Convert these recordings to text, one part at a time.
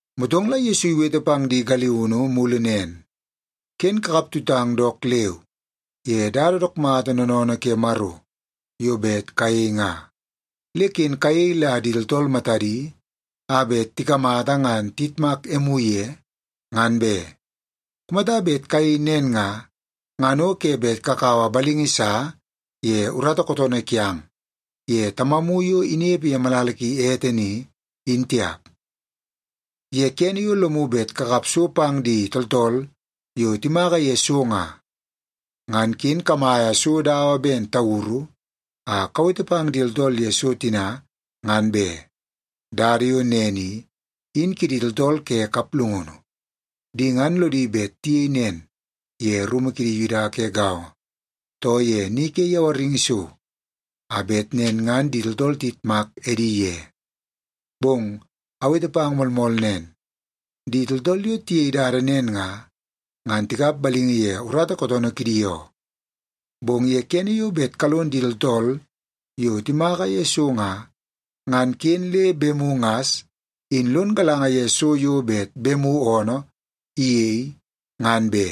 Motong la Yesu iwete pang di galiunu mulu nen, “Ken kakap tutang dook leu ye dada dook mata noonoonoo ke Maro yo bet kayei nga. Le ken kayei la di tooltool matadi a bet tikamata ngan tiyitmak emu ye, ngan be. Kumata bet kayei nen nga, ngan o ke bet kakaua balingi sa ye urata kootoonoo kiang ye Tamamu yo inepe ye malala ki ete ni, in tiap. “Ye kene yo lomu bet kakap so pang di tooltool yo timaka ye so nga, ngan ken kamaia so dawa ben tauru a kawete pang di tooltool ye so tina, ngan be. Dada yo nen i, in kidi tooltool ke kaplungunu. Di ngan lodi bet tiyei nen ye rumu kidi Yuda ke gaongo, too ye ni ke yawaringi so, a bet nen ngan di tooltool tiyitmak edi ye. Bong awete pang moolmool nen, di tooltool yo tiyei dada nen nga, ngan tikap balingi ye urata kootoonoo kidi oo. Bong ye kene yo bet kalon di tooltool yo timaka ye so nga, ngan ken le bemu ngas in lon galanga ye so yo bet bemu oonoo iyei, ngan be,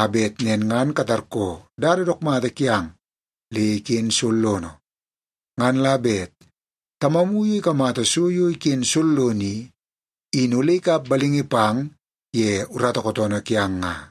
a bet nen ngan katarkoo dada dook mata kiang le iken sollono. Ngan la bet Tamamu yo ikamata so yo iken sollono i, in ole ikap balingi pang ye urata kootoonoo kiang nga.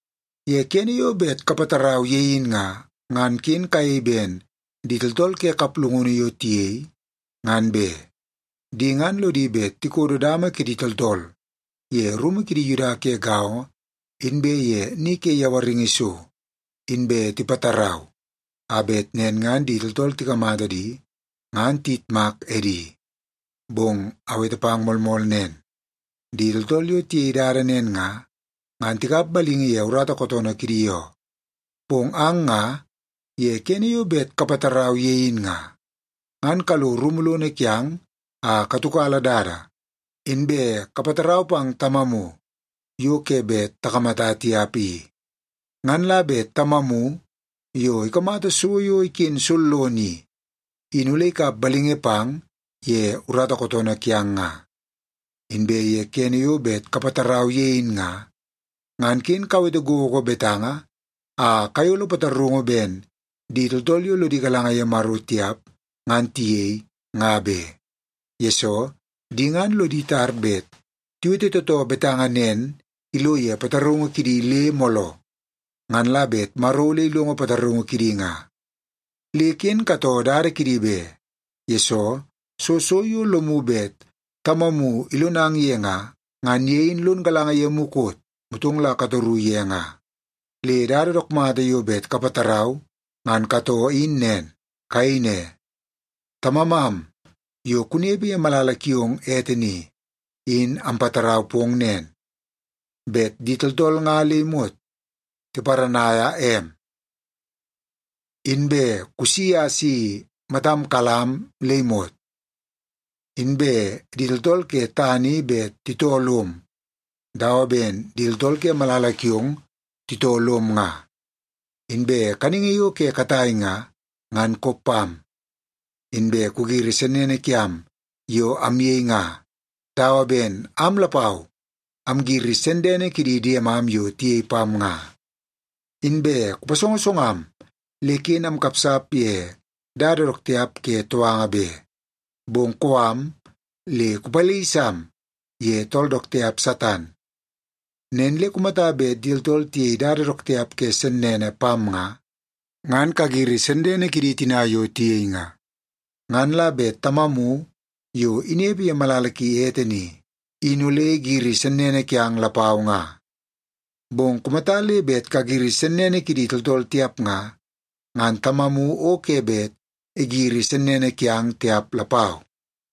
“Ye kene yo bet kapatarau ye in nga, ngan ken kayei ben di tooltool ke kaplungunu yo tiyei, ngan be. Di ngan lodi bet tikodo dama kidi tooltool ye rumu kidi Yuda ke gaongo inbe ye ni ke yawaringi so, inbe tipatarau a bet nen ngan di tooltool tikamata di, ngan tiyitmak edi. Bong awete pang moolmool nen, di tooltool yo tiyei dada nen nga, ngan tikap balingi ye urata kootoonoo kidi oo. Bong ang nga ye kene yo bet kapatarau ye in nga, ngan kalo rumu lono kiang a katiukala dada, inbe kapatarau pang Tamamu yo ke bet takamata tiap i. Ngan la bet Tamamu yo ikamata so yo iken sollono i, in ole ikap balingi pang ye urata kootoonoo kiang nga. “Inbe ye kene yo bet kapatarau ye in nga, ngan ken kawete gogo betanga a kayolo pataraungu ben di tooltool yo lodi galanga ye Maro tiap ngan tiyei, nga be. Yesoo, di ngan lodi tar bet tiwete tootoo betanga nen ilo ye pataraungu kidi le mooloo, ngan la bet Maro ole ilongo pataraungu kidi nga. Le ken katoo dada kidi be, yesoo soo so yo lomu bet Tamamu ilonang ye nga, ngan ye in lon galanga ye mukot, motong la katoru ye nga. Le dada dook mata yo bet kapatarau ngan katoo in nen. Kayei ne, ‘Tamamam yo kunepe ye malala kiong ete ni, in ampatarau pong nen, bet di tooltool nga le imot tiparanaia em. Inbe kusi a si matam kalam am le imot, inbe di tooltool ke tana i bet titoo lom dawa ben di tooltool ke malala kiong titoo lom nga. Inbe kaningi yo ke katai nga, ngan kop pam. Inbe kugiri sennene kiam yo amyei nga, dawa ben am lapau amgiri sennene kidi diemam yo tiyei pam nga. Inbe kupasongosongam le ken amkapsap ye dada dook tiap ke touanga be, bong kou am le kupalisam ye tool dook tiap Satan.’ “Nen le kumata bet di tooltool tiyei dada dook tiap ke sennene pang nga, ngan kagiri sennene kidi tina yo tiyei nga. Ngan la bet Tamamu yo inepe ye malala ki ete ni, in ole igiri sennene kiang lapau nga. Bong kumata le bet kagiri sennene kidi tooltool tiap nga, ngan Tamamu o ke bet igiri sennene kiang tiap lapau.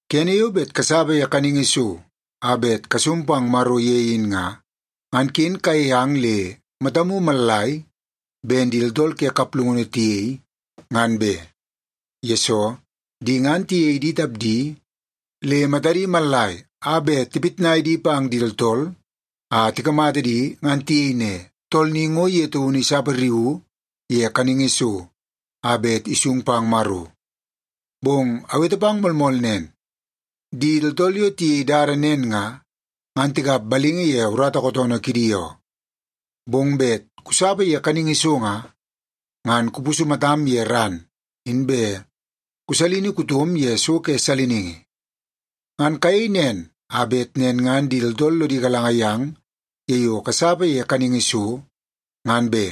“Kene yo bet kasapa ye kaningi so a bet kasung pang Maro ye in nga, ngan ken kayei ang le matamu mallai ben di tooltool ke kaplungunu tiyei, ngan be. Yesoo, di ngan tiyei di tapdi le matadi mallai a bet tipitnai di pang di tooltool a tikamata di ngan tiyei ne, ‘Tool ni ngo ye taunu isapariuu ye kaningi so a bet isung pang Maro.’ Bong awete pang moolmool nen, di tooltool yo tiyei dada nen nga, ngan tikap balingi ye urata kootoonoo kidi oo. Bong bet kusapa ye kaningi so nga, ngan kupusu matam ye ran, inbe kusalini kutom ye so ke saliningi. Ngan kayei nen a bet nen ngan di tooltool lodi galanga yang ye yo kasapa ye kaningi so, ngan be.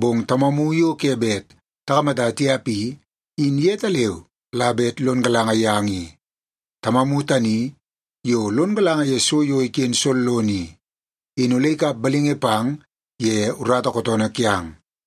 Bong Tamamu yo ke bet takamata tiap i, in yetaleu la bet lon galanga yang i. Tamamu tani yo lon galanga ye so yo iken sollono i, in ole ikap balingi pang ye urata kootoonoo kiang.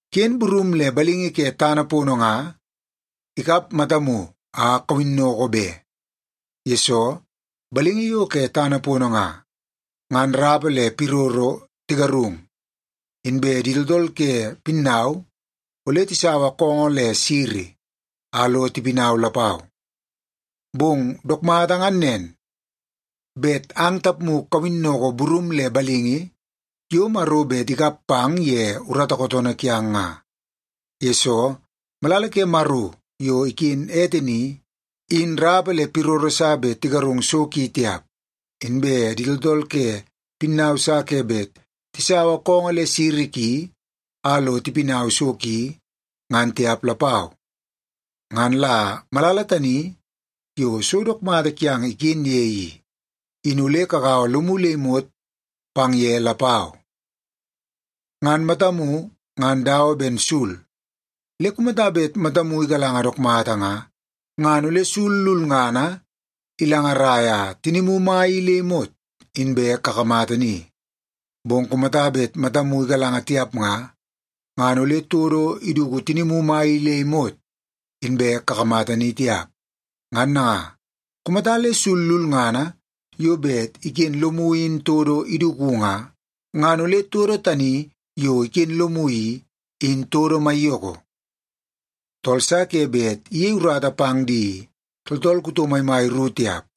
“Ken burum le balingi ke tana pono nga ikap matamu a kawinnoko be. Yesoo, balingi yo ke tana pono nga, ngan rapa le piroro tigarung, inbe di tooltool ke pinnau ole tisaua koongoo le siri a lo tipinau lapau. Bong dook mata ngan nen, bet ang tapmu kawinnoko burum le balingi yo Maro bet ikap pang ye urata kootoonoo kiang nga. Yesoo, malala ke Maro yo iken ete ni, in rapa le piroro sa bet tigarung so ki tiap, inbe di tooltool ke pinnau sa ke bet tisaua koongoo le siri ki a lo tipinau so ki, ngan tiap lapau. Ngan la malala tani yo so dook mata kiang iken ye i, in ole kagaua lomu le imot pang ye lapau. “Ngan matamu ngan dawa ben sul. Le kumata bet matamu igalanga dook mata nga, ngan ole sul lulngana ilangaraia tinimu mai i le imot inbe kakamata ni. Bong kumata bet matamu igalanga tiap nga, ngan ole todo iduku tinimu mai i le imot inbe kakamata ni tiap. Ngan nanga, kumata le sul lulngana yo bet iken lomu in todo iduku nga, ngan ole todo tani yo iken lomu i, in todo maiyoko. “Tool sa ke bet iyei urata pang di tooltool kuto maimai ru tiap.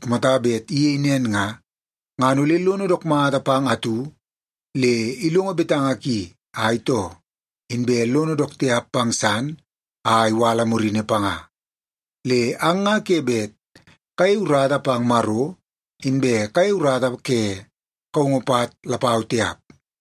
Kumata bet iyei nen nga, ngan ole lono dook mata pang atu le ilongo betanga ki a itoo, inbe lono dook tiap pang san a iwala murini panga. Le ang nga ke bet kayei urata pang Maro, inbe kayei urata ke kaungu pat lapau tiap.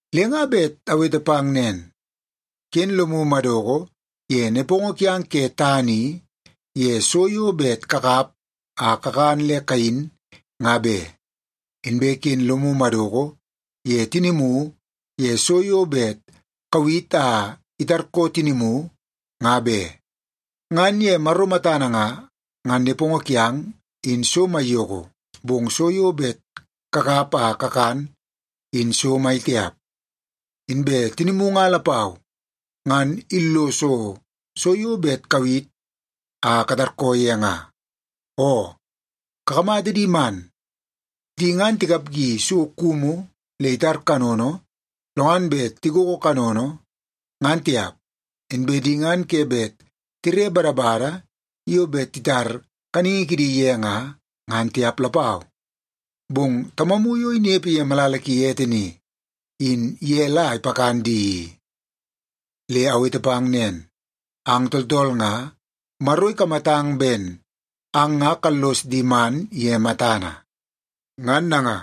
“Le nga bet awete pang nen, ken lomu madoko ye nepongo kiang ke tana i, ye so yo bet kakap a kakan le kayin, nga be. Inbe ken lomu madoko ye tinimu ye so yo bet kawit a itarkoo tinimu, nga be. Ngan ye Maro matana nga, ngan nepongo kiang, in so maiyoko, bong so yo bet kakap a kakan, in so mai tiap. Inbe tinimu nga lapau, ngan illoso so yo bet kawit a katarkoo ye nga. Oo, kakamata di man. Di ngan tikapgi so kumu le itar kanono, lo ngan bet tigogo kanono, ngan tiap. Inbe di ngan ke bet tire badabada yo bet titar kaningi kidi ye nga, ngan tiap lapau, bong Tamamu yo inepe ye malala ki ete ni, in ye la ipakan di i. Le awete pang nen, ang tooltool nga, Maro ikamatang ben ang nga kallos di man ye matana. Ngan nanga,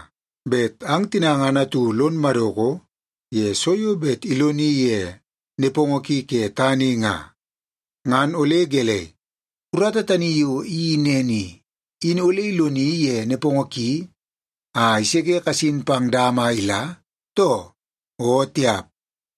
bet ang tina ngan atu lon madoko ye so yo bet iloni ye nepongo ki ke tana i nga, ngan ole gelei, urata tani yo iyeii nen i, in ole iloni ye nepongo ki a iseke kasin pang dama a ila, too? O tiap!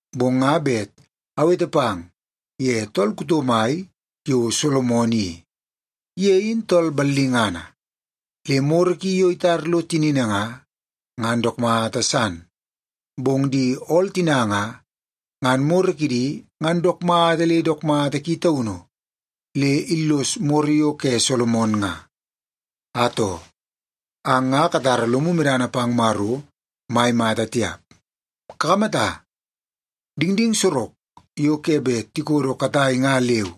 Bong nga bet awete pang ye tool kuto mai yo Solomon i. Ye in tool ballingana, le moro ki yo itar lo tinini nga, ngan dook mata san. Bong di ool tina nga, ngan moro kidi ngan dook mata le dook mata ki taunu le illos moro yo ke Solomon nga. Atoo, ang nga katara lomu medana pang Maro mai mata tiap. Kakamata, dingding sorok yo ke bet tikodo katai nga leu,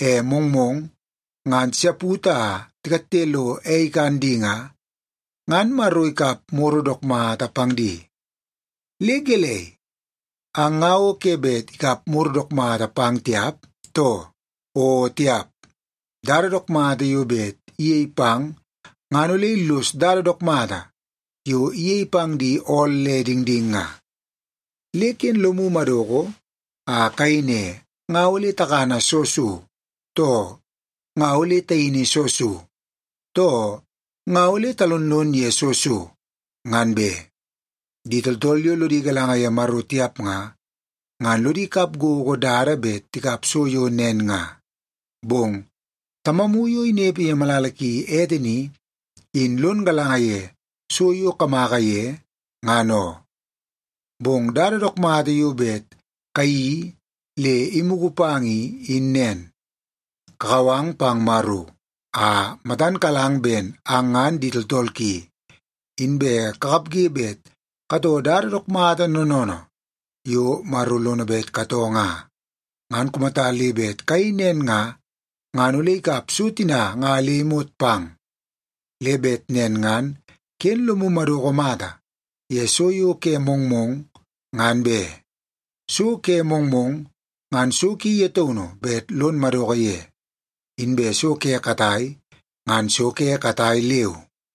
e mongmong ngan tisaput a tikatte lo ei ikan di nga, ngan Maro ikap moro dook mata pang di. Le gelei, ang nga o ke bet ikap moro dook mata pang tiap, too? O tiap! Dada dook mata yo bet iyei pang ngan ole illos dada dook mata yo iyei pang di ool le dingding nga. Le ken lomu madoko a kayei ne, ‘Nga ole takana soo so?’ too ‘Nga ole tayini soo so?’ too ‘Nga ole talonlon ye soo so?’ ngan be. Di tooltool yo lodi galanga ye Maro tiap nga, ngan lodi kap gogo dada bet tikap so yo nen nga. Bong Tamamu yo inepe ye malala ki ete ni, in lon galanga ye so yo kamaka ye, ngan oo. Bong dada dook mata yo bet kayeii le imugu pang i, in nen. Kakau ang pang Maro a matan kalang ben ang ngan di tooltool ki, inbe kakapge bet katoo dada dook mata noonoonoo yo Maro lono bet katoo nga. Ngan kumata le bet kayei nen nga, ngan ole ikap so tina nga le imot pang. Le bet nen ngan ken lomu madoko mata ye so yo ke mongmong, ngan be. So ke mongmong, ngan so ki ye taunu bet lon madoko ye. Inbe so ke katai, ngan so ke katai leu.”